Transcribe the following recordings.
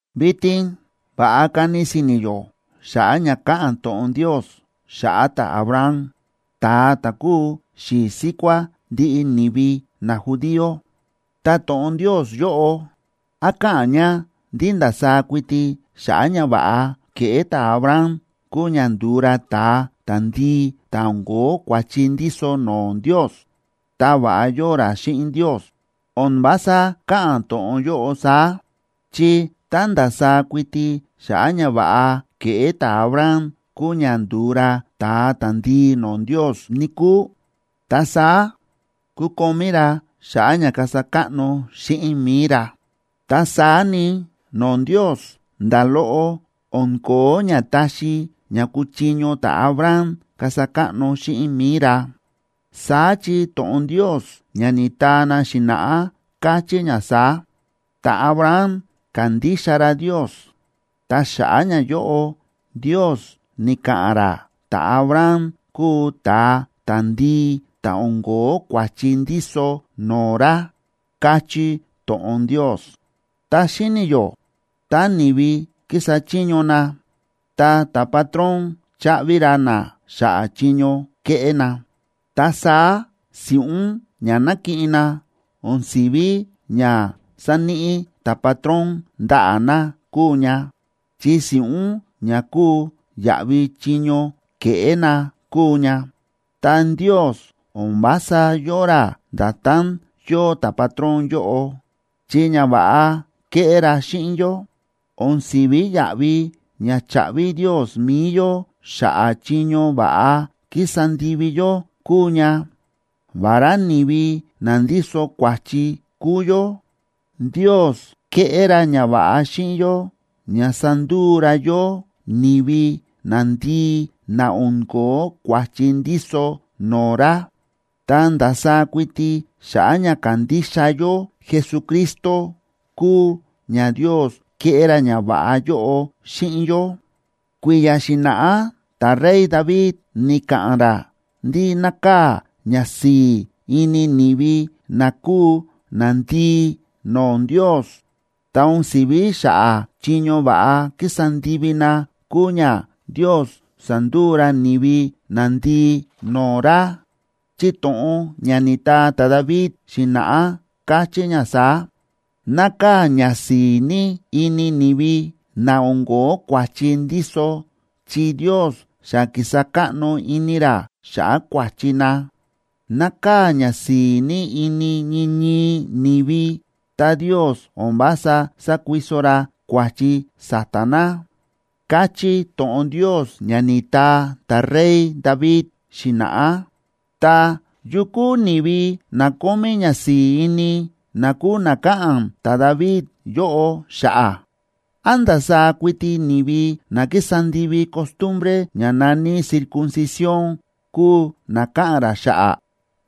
Vitin va̱ꞌa kani si̱ni̱ yó xa̱ꞌa̱ ña káꞌa̱n to̱ꞌon Ndios xa̱ꞌa̱ ta̱Abraham, ta̱a ta̱ kúu xi̱i̱ síkuá ndiꞌi ni̱vi najudío. Ta to̱ꞌon Ndios yóꞌo, ¿án káꞌa̱n ña ndí ndasaá kuiti xa̱ꞌa̱ ñava̱ꞌa ke̱ꞌé ta̱Abraham kúu ña ndu̱u ra ta̱a ta̱ndii ta̱ o̱n ko̱ó kua̱chi ndíso no̱o̱ Ndios, ta va̱ꞌa yóo ra xíꞌin Ndios? O̱n vása káꞌa̱n to̱ꞌon yóꞌo saá. Chi tá ndasaá kuiti xa̱ꞌa̱ ñava̱ꞌa ke̱ꞌé ta̱Abraham kúu ña ndu̱u ra ta̱a ta̱ndii no̱o̱ Ndios, níkúu, ta saá kukomí ra xa̱ꞌa̱ ña kasa káꞌno xíꞌin mi̱i ra. Ta saá ni, no̱o̱ Ndios, nda̱ loꞌo o̱n ko̱ó ña taxi ña kuchiño ta̱Abraham kasa káꞌno xíꞌin mi̱i ra. Saá chi to̱ꞌon Ndios ña ni̱taa na xi̱na̱ꞌá káchí ña saá: “Ta̱Abraham ka̱ndixa ra Ndios, ta xa̱ꞌa̱ ñayóꞌo Ndios ni̱ka̱ꞌa̱n ra ta̱Abraham kúu ta̱a ta̱ndii ta̱ o̱n ko̱ó kua̱chi ndíso no̱o̱ ra”, káchí to̱ꞌon Ndios. Ta xíni̱ yó tá ni̱vi kísa chiño na, ta ta̱patrón cháꞌvi ra na xa̱ꞌa̱ chiño ke̱ꞌé na. Ta saá si̱ꞌún ña nákiꞌin na, o̱n si̱ví ña sáníꞌi ta̱patrón ndaꞌa̱ na kúu ña, chi si̱ꞌún ña kúu yaꞌvi chiño ke̱ꞌé na kúu ña. Ta Ndios o̱n vása yóo ra nda̱tán yóo ta̱patrón yóꞌo, chi ñava̱ꞌa ke̱ꞌé ra xíꞌin yó, o̱n si̱ví yaꞌvi ña cháꞌvi Ndios mi̱i yó xa̱ꞌa̱ chiño va̱ꞌa ki̱sa ndivi yó kúu ña. Vará ni̱vi na ndíso kua̱chi kúu yó, Ndios ke̱ꞌé ra ñava̱ꞌa xíꞌin yó ña sa̱nduu ra yó ni̱vi nandii na o̱n ko̱ó kua̱chi ndíso no̱o̱ ra. Ta ndasaá kuiti xa̱ꞌa̱ ña kándixa yó Jesucristo, kúu ña Ndios ke̱ꞌé ra ñava̱ꞌa yóꞌo xíꞌin yó. Kui̱ya̱ xi̱na̱ꞌá ta̱rey David ni̱ka̱ꞌa̱n ra ndí nákaa̱ ñasi̱i̱ ini ni̱vi na kúu nandii no̱o̱ Ndios. Ta o̱n si̱ví xa̱ꞌa̱ chiño va̱ꞌa ki̱sa ndivi na kúu ña Ndios sa̱nduu ra ni̱vi nandii no̱o̱ ra, chi to̱ꞌon ña ni̱taa ta̱David xi̱na̱ꞌá, káchí ña saá: Nákaa̱ ñasi̱i̱ ní ini ni̱vi, na o̱n ko̱ó kua̱chi ndíso, chi Ndios xa ki̱sa káꞌno ini ra xa̱ꞌa̱ kua̱chi na. Nákaa̱ ñasi̱i̱ ní ini ñii ñii ni̱vi tá Ndios o̱n vása sákuiso ra kua̱chi sa̱ta̱ na, káchí to̱ꞌon Ndios ña ni̱taa ta̱rey David xi̱na̱ꞌá. Ta, ¿yu kúu ni̱vi na kómí ñasi̱i̱ ini, na kúu na káꞌa̱n ta̱David yóꞌo xa̱ꞌa̱? ¿Án ndasaá kuiti ni̱vi na ki̱sa ndivi costumbre ña na̱ní circuncisión kúu na káꞌa̱n ra xa̱ꞌa̱?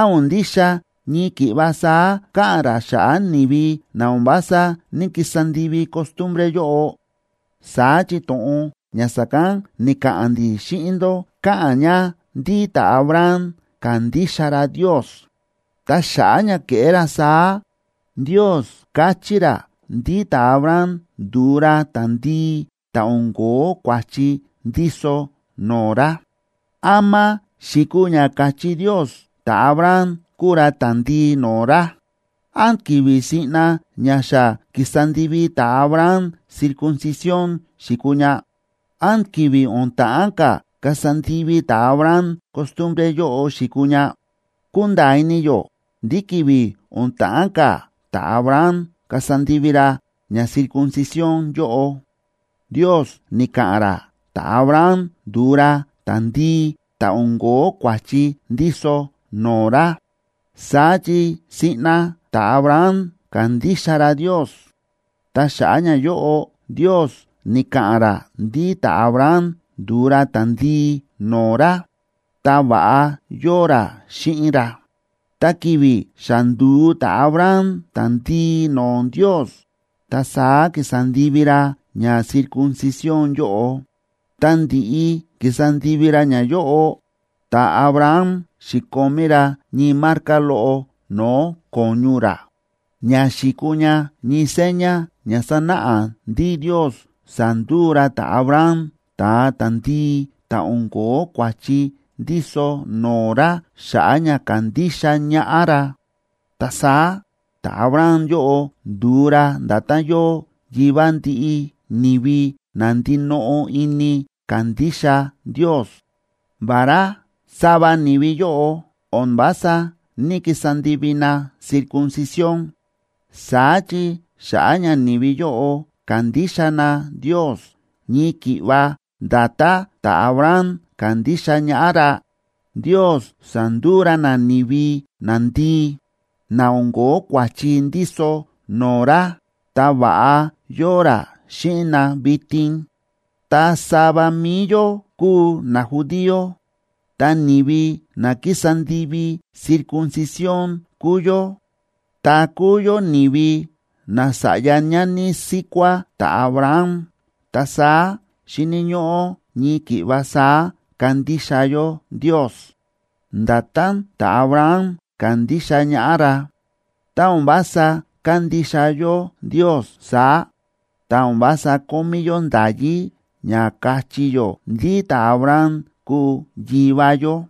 ¿Án o̱n ndixa ñii ki̱ꞌva saá káꞌa̱n ra xa̱ꞌa̱ ni̱vi na o̱n vása ní‑kisa ndivi costumbre yóꞌo? Saá chi to̱ꞌon ña sa̱kán ni̱ka̱ꞌa̱n ndi̱ xíꞌin ndó káꞌa̱n ña ndí ta̱Abraham ka̱ndixa ra Ndios, ta xa̱ꞌa̱ ña ke̱ꞌé ra saá, Ndios ka̱chí ra ndí ta̱Abraham ndu̱u ra ta̱ndii ta̱ o̱n ko̱ó kua̱chi ndíso no̱o̱ ra. ¿Ama xi̱kuu ña ka̱chí Ndios ta̱Abraham kúu ra ta̱ndii no̱o̱ ra? ¿Án ki̱vi̱ siꞌna ña xa ki̱sa ndivi ta̱Abraham circuncisión xi̱kuu ña? ¿Án ki̱vi̱ o̱n ta̱ꞌán ka̱ kasa ndivi ta̱Abraham costumbre yóꞌo xi̱kuu ña? Kúnda̱a̱ ini yó ndí ki̱vi̱ o̱n ta̱ꞌán ka̱ ta̱Abraham kasa ndivi ra ña circuncisión yóꞌo, Ndios ni̱ka̱ꞌa̱n ra ta̱Abraham ndu̱u ra ta̱ndii ta̱ o̱n ko̱ó kua̱chi ndíso no̱o̱ ra. Saá chi siꞌna ta̱Abraham ka̱ndixa ra Ndios, ta xa̱ꞌa̱ ñayóꞌo Ndios ni̱ka̱ꞌa̱n ra ndí ta̱Abraham ndu̱u ra ta̱ndii no̱o̱ ra ta va̱ꞌa yóo xíꞌin ra. Ta ki̱vi̱ xa ndu̱u ta̱Abraham ta̱ndii no̱o̱ Ndios, ta saá ki̱sa ndivi ra ña circuncisión yóꞌo. Ta ndi̱ꞌi ki̱sa ndivi ra ñayóꞌo, ta̱Abraham xi̱komí ra ñii marca loꞌo no̱o̱ ko̱ñu ra, ña xi̱kuu ña ñii seña ña sa̱náꞌa ndí Ndios sa̱nduu ra ta̱Abraham ta̱a ta̱ndii ta̱ o̱n ko̱ó kua̱chi ndíso no̱o̱ ra xa̱ꞌa̱ ña ka̱ndixa ñaꞌá ra. Ta saá ta̱Abraham yóꞌo ndu̱u ra nda̱tán yóo yivá ndiꞌi ni̱vi na ndinoꞌo ini kándixa Ndios, vará sava ni̱vi yóꞌo o̱n vása ní‑kisa ndivi na circuncisión. Saá chi xa̱ꞌa̱ ña ni̱vi yóꞌo kándixa na Ndios ñii ki̱ꞌva nda̱tán ta̱Abraham ka̱ndixa ñaꞌá ra, Ndios sa̱nduu ra na ni̱vi nandii, na o̱n ko̱ó kua̱chi ndíso no̱o̱ ra, ta va̱ꞌa yóo ra xíꞌin na vitin. Ta sava mi̱i yó kúu najudío, ta ni̱vi na kísa ndivi circuncisión kúu yó, ta kúu yó ni̱vi nasa̱ꞌya ñani síkuá ta̱Abraham. Ta saá, xíni̱ ñóꞌó ñii ki̱ꞌva saá kandixa yó Ndios, nda̱tán ta̱Abraham ka̱ndixa ñaꞌá ra. Tá o̱n vása kándixa yó Ndios saá, ta o̱n vása kómí yó nda̱yí ña káchí yó ndí ta̱Abraham kúu yivá yó.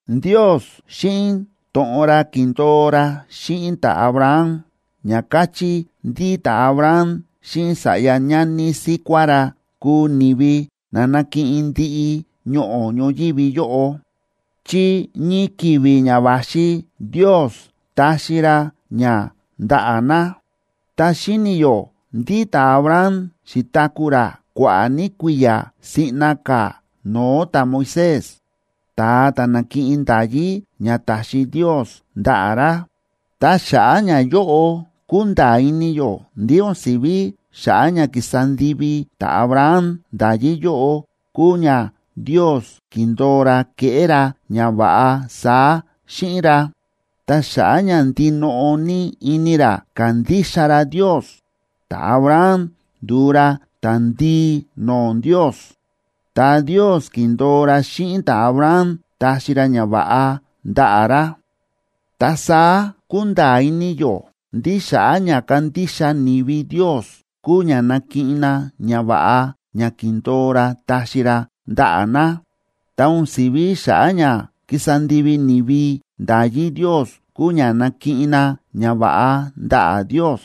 Ndios xíꞌin to̱ꞌon ra ki̱ndo̱o ra xíꞌin ta̱Abraham, ña káchí ndí ta̱Abraham xíꞌin sa̱ꞌya ñani síkuá ra kuu ni̱vi na nakiꞌin ndiꞌi ñoꞌo̱ ñoyívi yóꞌo, chi ñii ki̱vi̱ ña va̱xi Ndios taxi ra ña ndaꞌa̱ na. Ta xíni̱ yó ndí ta̱Abraham xi̱taku̱ ra kua̱ꞌa̱ ní kui̱ya̱ siꞌna ka̱ no̱o̱ ta̱Moisés, ta̱a ta̱ na̱kiꞌin nda̱yí ña ta̱xi Ndios ndaꞌa̱ ra. Ta xa̱ꞌa̱ ñayóꞌo kúnda̱a̱ ini yó ndí o̱n si̱ví xa̱ꞌa̱ ña ki̱sa ndivi ta̱Abraham nda̱yí yóꞌo kúu ña Ndios ki̱ndo̱o ra keꞌé ra ñava̱ꞌa saá xíꞌin ra. Ta xa̱ꞌa̱ ña ndinoꞌo ní ini ra ka̱ndixa ra Ndios, ta̱Abraham ndu̱u ra ta̱ndii no̱o̱ Ndios, ta Ndios ki̱ndo̱o ra xíꞌin ta̱Abraham taxi ra ñava̱ꞌa ndaꞌa̱ ra. Ta saá kúnda̱a̱ ini yó ndí xa̱ꞌa̱ ña kándixa ni̱vi Ndios kúu ña nakiꞌin na ñava̱ꞌa ña ki̱ndo̱o ra taxi ra ndaꞌa̱ na. Ta o̱n si̱ví xa̱ꞌa̱ ña kísa ndivi ni̱vi nda̱yí Ndios kúu ña nakiꞌin na ñava̱ꞌa ndaꞌa̱ Ndios.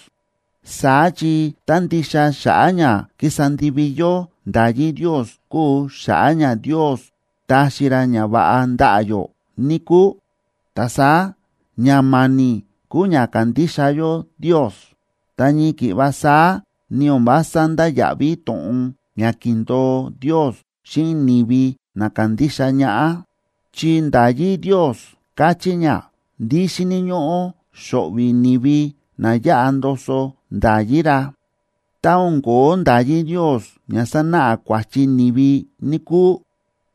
Saá chi tá ndixa xa̱ꞌa̱ ña kísa ndivi yó nda̱yí Ndios kúu xa̱ꞌa̱ ña Ndios táxi ra ñava̱ꞌa ndaꞌa̱ yó, níkúu, ta saá ña ma̱ni̱ kúu ña kándixa yó Ndios, ta ñii ki̱ꞌva saá, ni o̱n vása ndáya̱ꞌví to̱ꞌon ña ki̱ndo̱o Ndios xíꞌin ni̱vi na kándixa ñaꞌá. Chi nda̱yí Ndios káchí ña ndí xíni̱ ñóꞌó xo̱ꞌvi̱ ni̱vi na yáꞌa ndoso nda̱yí ra. Tá o̱n ko̱ó nda̱yí Ndios ña sánáꞌa kua̱chi ni̱vi, níkúu,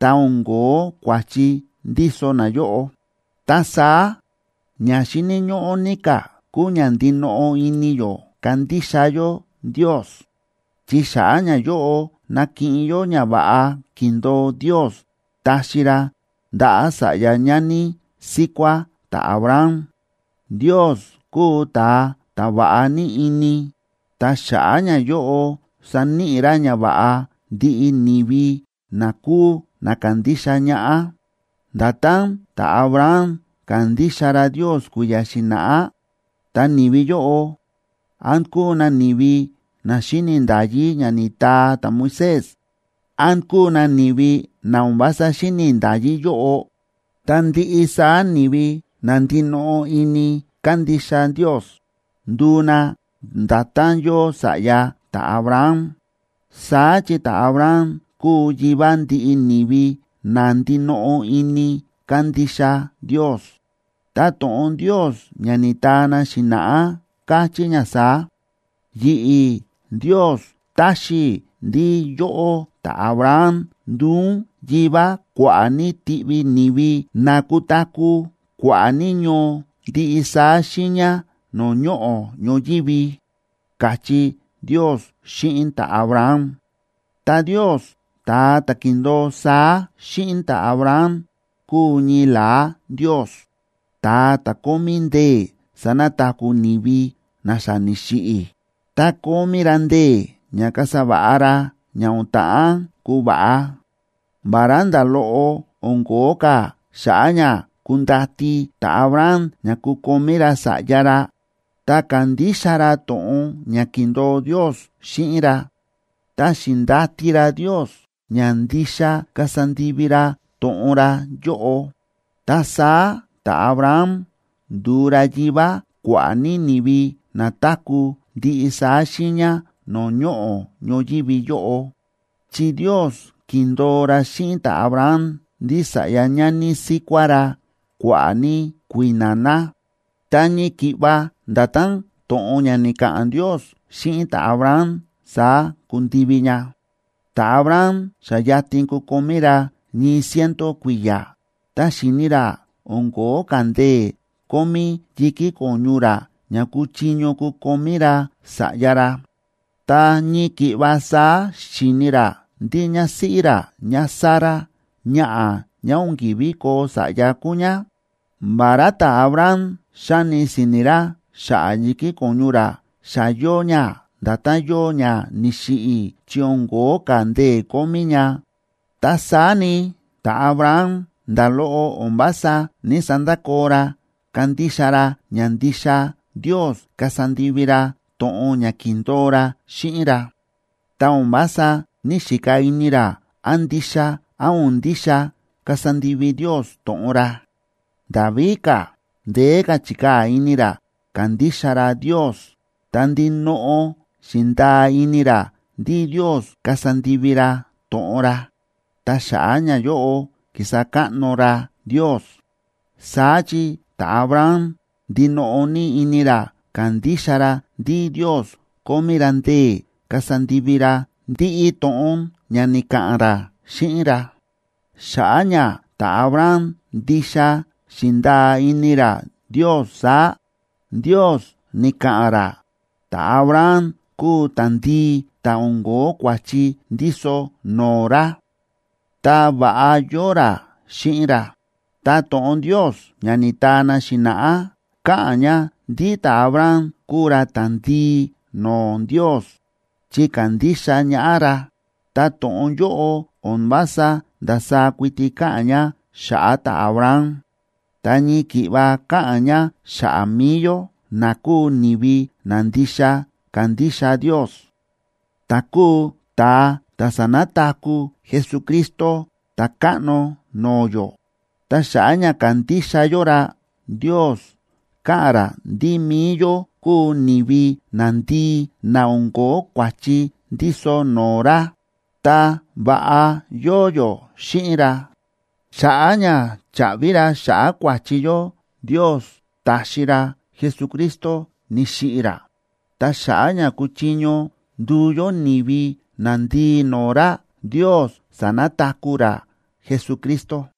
ta o̱n kóo kua̱chi ndíso nayóꞌo. Ta saá, ña xíni̱ ñóꞌó ní ka̱ kúu ña ndinoꞌo ini yó kándixa yó Ndios, chi xa̱ꞌa̱ ñayóꞌo nakiꞌin yó ñava̱ꞌa ki̱ndo̱o Ndios taxi ra ndaꞌa̱ sa̱ꞌya ñani síkuá ta̱Abraham. Ndios kúu ta̱a ta̱ va̱ꞌa ní ini, ta xa̱ꞌa̱ ñayóꞌo saníꞌi ra ñava̱ꞌa ndiꞌi ni̱vi na kúu na kándixa ñaꞌá, nda̱tán ta̱Abraham ka̱ndixa ra Ndios kui̱ya̱ xi̱na̱ꞌá. Ta ni̱vi yóꞌo, án kúu na ni̱vi na xíni̱ nda̱yí ña ni̱taa ta̱Moisés, án kúu na ni̱vi na o̱n vása xíni̱ nda̱yí yóꞌo, ta ndiꞌi saá ni̱vi na ndinoꞌo ini kándixa Ndios, nduu na nda̱tán yóo sa̱ꞌya ta̱Abraham. Saá chi ta̱Abraham kúu yivá ndiꞌi ni̱vi na ndinoꞌo ini kándixa Ndios. Ta to̱ꞌon Ndios ña ni̱taa na xi̱na̱ꞌá káchí ña saá: “Yi̱ꞌi̱, Ndios, taxi i̱ ndí yóꞌó ta̱Abraham nduu ún yivá kua̱ꞌa̱ ní tiꞌvi ni̱vi na kutaku̱ kua̱ꞌa̱ ní ñoo ndiꞌi saá xiiña no̱o̱ ñoꞌo̱ ñoyívi”, káchí Ndios xíꞌin ta̱Abraham. Ta Ndios, ta̱a ta̱ ki̱ndo̱o saá xíꞌin ta̱Abraham, kúu ñii la̱á Ndios, ta̱a ta̱ kómí ndee̱ sanataku̱ ni̱vi na xa ni̱xiꞌi̱, ta kómí ra ndee̱ ña kasa va̱ꞌa ra ña o̱n ta̱ꞌán kuva̱ꞌa. Vará nda̱ loꞌo o̱n ko̱ó ka̱ xa̱ꞌa̱ ña kundati ta̱Abraham ña kukomí ra sa̱ꞌya ra, ta ka̱ndixa ra to̱ꞌon ña ki̱ndo̱o Ndios xíꞌin ra, ta xi̱ndati ra Ndios ña ndixa kasa ndivi ra to̱ꞌon ra yóꞌo. Ta saá ta̱Abraham ndu̱u ra yivá kua̱ꞌa̱ ní ni̱vi na táku̱ ndiꞌi saá xiiña no̱o̱ ñoꞌo̱ ñoyívi yóꞌo. Chi Ndios ki̱ndo̱o ra xíꞌin ta̱Abraham ndí sa̱ꞌya ñani síkuá ra kua̱ꞌa̱ ní kui̱na̱ na, ta ñii ki̱ꞌva nda̱tán to̱ꞌon ña ni̱ka̱ꞌa̱n Ndios xíꞌin ta̱Abraham, saá ku̱ndivi ña. Ta̱Abraham xa yatin kukomí ra ñii ciento kui̱ya̱, ta xíni̱ ra o̱n ko̱ó ka̱ ndee̱ kómí yi̱kí ko̱ñu ra ña kuchiño kukomí ra sa̱ꞌya ra, ta ñii ki̱ꞌva saá xíni̱ ra ndí ñásíꞌí ra ñáSara, ñaꞌa̱ ñá o̱n ki̱ví koo sa̱ꞌya kúu ñá. Vará ta̱Abraham xáni si̱ni̱ ra xa̱ꞌa̱ yi̱kí ko̱ñu ra xa yóo ña nda̱tán yóo ña ni̱xiꞌi̱ chi o̱n ko̱ó ka̱ ndee̱ kómí ña, ta saá ni, ta̱Abraham nda̱ loꞌo o̱n vása ní‑sandakoo ra kándixa ra ña ndixa Ndios kasa ndivi ra to̱ꞌon ña ki̱ndo̱o ra xíꞌin ra. Ta o̱n vása ní‑xika ini ra án ndixa án o̱n ndixa kasa ndivi Ndios to̱ꞌon ra. Nda̱ víka̱, ndeé ka̱ chi̱kaa̱ ini ra kándixa ra Ndios, ta ndinoꞌo xi̱ndaa ini ra ndí Ndios kasa ndivi ra to̱ꞌon ra. Ta xa̱ꞌa̱ ñayóꞌo, ki̱sa káꞌno ra Ndios. Saá chi ta̱Abraham ndinoꞌo ní ini ra ka̱ndixa ra ndí Ndios kómí ra ndee̱ kasa ndivi ra ndiꞌi to̱ꞌon ña ni̱ka̱ꞌa̱n ra xíꞌin ra. Xa̱ꞌa̱ ña ta̱Abraham ndixa xi̱ndaa ini ra Ndios saá, Ndios ni̱ka̱ꞌa̱n ra ta̱Abraham kúu ta̱ndii ta̱ o̱n ko̱ó kua̱chi ndíso no̱o̱ ra, ta va̱ꞌa yóo ra xíꞌin ra. Ta to̱ꞌon Ndios ña ni̱taa na xi̱na̱ꞌá, káꞌa̱n ña ndí ta̱Abraham kúu ra ta̱ndii no̱o̱ Ndios chi ka̱ndixa ñaꞌá ra, ta to̱ꞌon yóꞌo o̱n vása ndasaá kuiti káꞌa̱n ña xa̱ꞌa̱ ta̱Abraham, ta ñii ki̱ꞌva káꞌa̱n ña xa̱ꞌa̱ mi̱i yó, na kúu ni̱vi na ndixa kándixa Ndios, ta̱ kúu ta̱a ta̱ sa̱nataku̱ Jesucristo Ta̱káꞌno no̱o̱ yó. Ta xa̱ꞌa̱ ña kándixa yó ra, Ndios ka̱ꞌa̱n ra ndí mi̱i yó kúu ni̱vi nandii na o̱n ko̱ó kua̱chi ndíso no̱o̱ ra, ta va̱ꞌa yóo yó xíꞌin ra. Xa̱ꞌa̱ ña chaꞌvi ra xa̱ꞌa̱ kua̱chi yó, Ndios ta̱xi ra Jesucristo ni̱xiꞌi̱ ra, ta xa̱ꞌa̱ ña kuchiño nduu yó ni̱vi nandii no̱o̱ ra, Ndios sa̱nataku̱ ra Jesucristo.